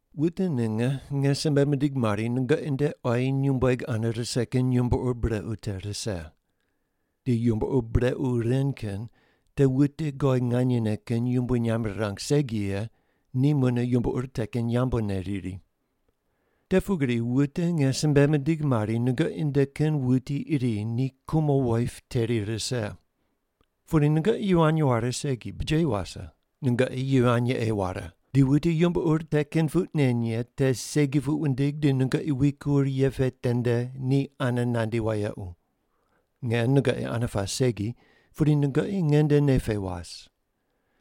Wute ninge nge simbe mindigh mari nungoqi nde quayi nyumbueg ane rise kin yumbo ur brequ te rise. Di yumbo ur brequ ren kin te wute God nganyene kin yumbui nyamb rirang segi ye ni mune yumbo ur te kin yambune riri. Te pugri wute nge simbe mindigh mari nungoqi nde kin wuti iri ni kumo woip teri rise. Pudi nungoqi yivany ware segi, bujeyi wase! Nungoqi yivany ei ware, di wuti yumbo ur te kin puq nen ye te segi puq wundig di nungoqi wikur ye pe tende ni ane nandi wayequ. Nge nungoqi ane pas segi, pudi nungoqi nge nde nei pe was.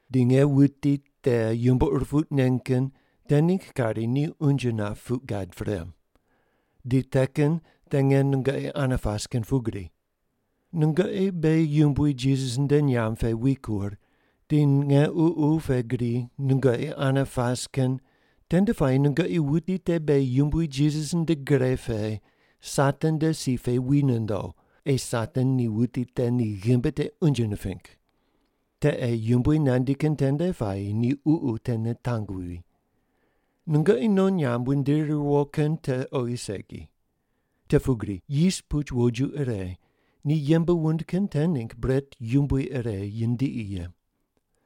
Di nge wuti te yumbo ur puq nen kin te ningg kari ni unje nap puq gad pre, di te kin te nge nungoqi ane pas kin pugri. Nungoqi beghi Yumbui Jisas nde nyamb pe wikur di nge ququ pe gri nungoqi ane pas kin tende puayi nungoqi wuti te beghi Yumbui Jisas nde gre pe Satan nde si pe wi nondo ei Satan ni wuti te ni ghimbi te unje niping. Te ei Yumbui nandi kin tende puayi ni ququ te nitang wuwi. Nungoqi non nyamb wundiri riwo kin te oghi segi. Te pugri yis puch woju ire ni yembe wund kin te ningg bret yumbui ire yindiqi ye.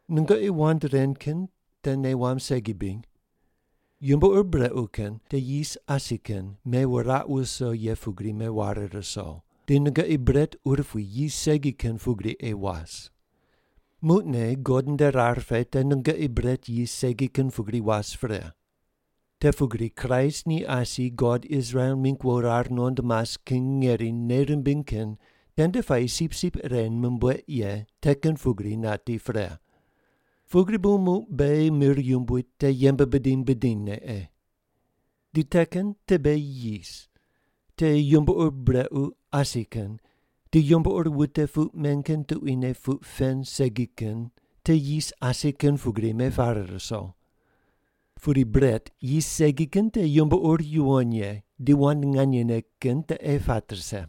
Nungoqi wand ren kin te nei wamb segi bri? Yumbo ur brequ kin te yis asi kin mewuraq wuso ye pugri meware ruso, di nungoqi bret urupui yis segi kin pugri ei was. Muqne God nde rar pe te nungoqi bret yis segi kin pugri was pre. Te pugri Kraist ni asi God Israel mingg wo rar nuqond mas kin ngeri nei rimbiny kin tende puayi sipsip ire mumbueq ye te kin pugri nati pre. Pugri bu muq beghi mir yumbui te yembe bidiny bidinyne ei. Di te kin te beghi yis, te yumbo ur brequ asi kin di yumbo ur wute puq men kin tuquine puq pen segi kin te yis asi kin pugri mepare ruso. Pudi bret yis segi kin te yumbo ur yuwon ye di wand nganyene kin te ei pat rise.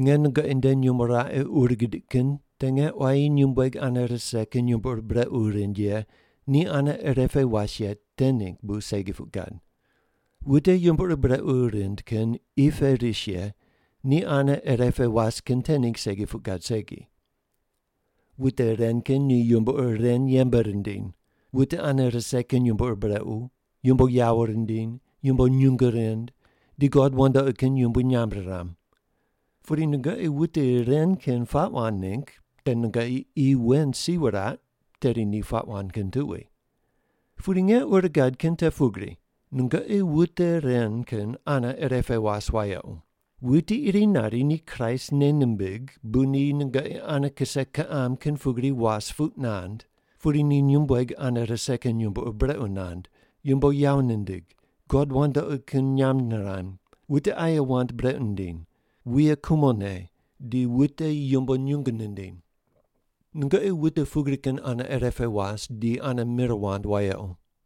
Nge nungoqi nde nyumo raqe ur gidiq kin te nge quayi nyumbueg ane rise kin yumbo ur brequ rind ye ni ane irepe was ye te ningg bu segi puq gad. Wute yumbo ur brequ rind kin qi pe ris ye ni ane irepe was kin te ningg segi puq gad segi. Wute ren kin ni yumbo ur ren yembe rindiny: Wute ane rise kin yumbo ur brequ, yumbo yawo rindiny, yumbo nyungu rind, di god wandoqi kin yumbui nyamb riram. Pudi nungoqi wute ren kin puaq wand ningg, te nungoqi qi wen si wuraq tedi ni puaq wand kin tuqui. Pudi nge ur gad kin te pugri, nungoqi wute ren kin ane irepe was wayequ: wuti iri nari ni Kraist nei nimbig bu ni nungoqi ane kise kiqam kin pugri was puq nand, pudi ni nyumbueg ane rise kin yumbo ur brequ nand, yumbo yawo nindig, god wandoqi kin nyamb niram, wute aye wand brequ nindiny, wuye kumo ne, di wute yumbo nyungu nindiny. Nungoqi wute pugri kin ane ire pe was di ane mir wand wayequ.